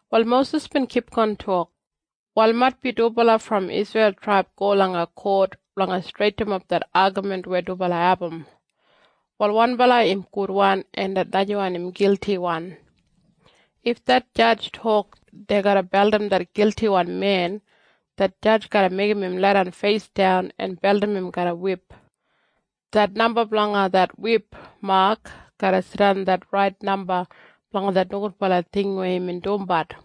Wal Mosis bin kipgon tok, “Wal maitbi dubala brom det Isreil traib go langa kot blanga streitinap det agamin weya dubala abum. Wal wanbala im gudwan en det najawan im giltiwan. If det jadj tok dei garra beldim det giltiwan men, det jadj garra meigim im leidan feisdan en beldim im garram wip. Det namba blanga det wip mak garra jidan det rait namba blanga det nogudbala ting weya imbin dumbat.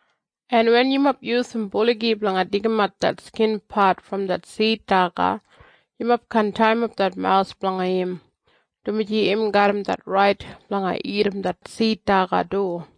“En wen yumob yusum buligi blanga deigimat det skinpat brom det sid daga, yumob kaan taiyimap det mawus blanga im, dumaji im garram det rait blanga dagat det sid daga du.”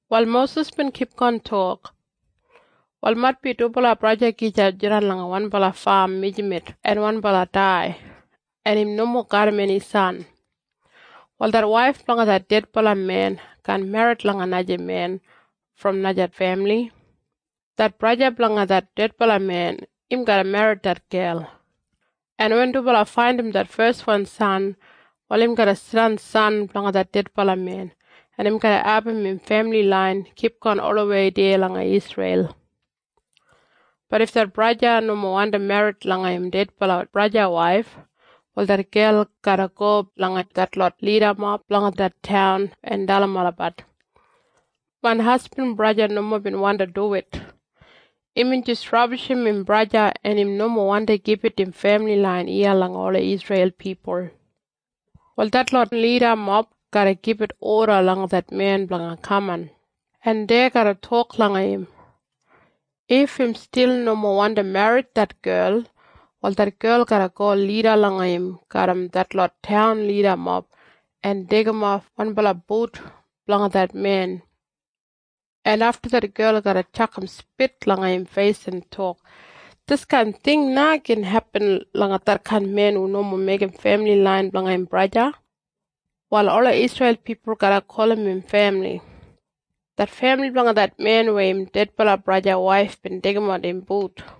Wal Mosis bin kipgon tok, “Wal maitbi dubala braja gija jidan langa wanbala fam mijamet en wanbala dai, en im nomo garram eni san. Wal det waif blanga det dedbala men kaan merrit langa naja men brom naja femili. Det braja blanga det dedbala men, im garra merrit det gel. En wen dubala faindim det feswan san, wal im garra jidan san blanga det dedbala men, en im garra abum im femili lain kipgon olawei deya langa Isreil. Bat if det braja nomo wandim merrit langa im dedbala braja waif, wal det gel garra go langa detlot lidamob blanga det taun en dalim olabat, ‘Main hasbin braja nomo bin wandi duwit. Imbin jis rabishim im braja en im nomo wandi gibit im femili lain iya langa ola Isreil pipul.’ Wal detlot lidamob garra gibit oda langa det men blanga kaman, en dei garra tok langa im. If im stil nomo wandi merrit det gel, wal det gel garra go deya lida langa im garram detlot lidamob en deigimof wanbala but blanga det men. En afta det gel garra tjakam spit langa im feis en tok, ‘Diskain ting na gin hepin langa detkain men hu nomo meigim femili lain blanga im braja.’ Wal ola Isreil pipul garra gulum im femili, ‘det femili blanga det men weya im dedbala braja waif bin deigimat im but.’”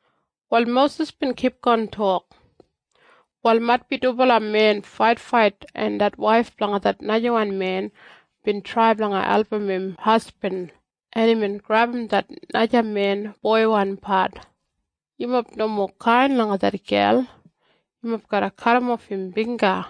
Wal Mosis bin kipgon tok, “Wal maitbi dubala men faitfait en det waif blanga det najawan men bin trai blanga album im hasbin, en imbin grebum det naja men boiwan pat. Yumob nomo kain langa det gel. Yumob garra kadimof im bingga.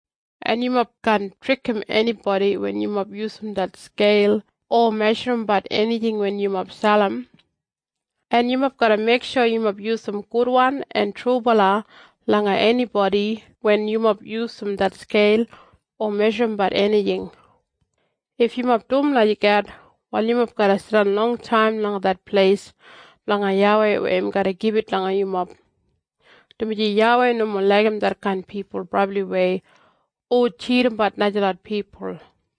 “En yumob kaan trikim enibodi wen yumob yusum det skeil o meshurumbat enijing wen yumob selim. En yumob garra meiksho yumob yusum gudwan en trubala langa enibodi wen yumob yusum det skeil o meshurumbat enijing. If yumob dum lagijat, wal yumob garra jidan longtaim langa det pleis blanga YAWEI weya im garra gibit langa yumob. Dumaji YAWEI nomo laigim detkain pipul brabliwei hu tjidimbat najalot pipul.”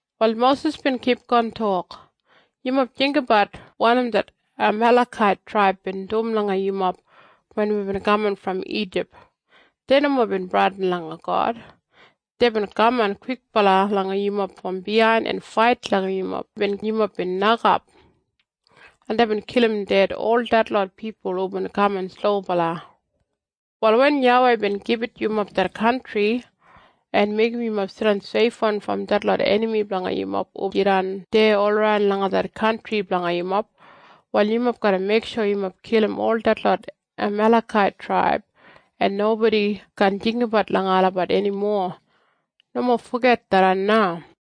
Wal Mosis bin kipgon tok, “Yumob jinggabat wanim det Amalekait traib bin dum langa yumob wen wibin kaman brom Ijip. Dei nomo bin bradin langa God. Deibin kaman kwikbala langa yumob brom biyain en fait langa yumob wen yumob bin nokap. En deibin kilim ded ol detlot pipul hubin kaman slobala. Wal wen YAWEI bin gibit yumob det kantri, en meigim yumob jidan seifwan brom detlot enami blanga yumob hu jidan deya olaran langa det kantri blanga yumob, wal yumob garra meiksho yumob kilim ol det Amalekait traib, en nobodi kaan jinggabat langa olabat enimo. Nomo foget tharran na.”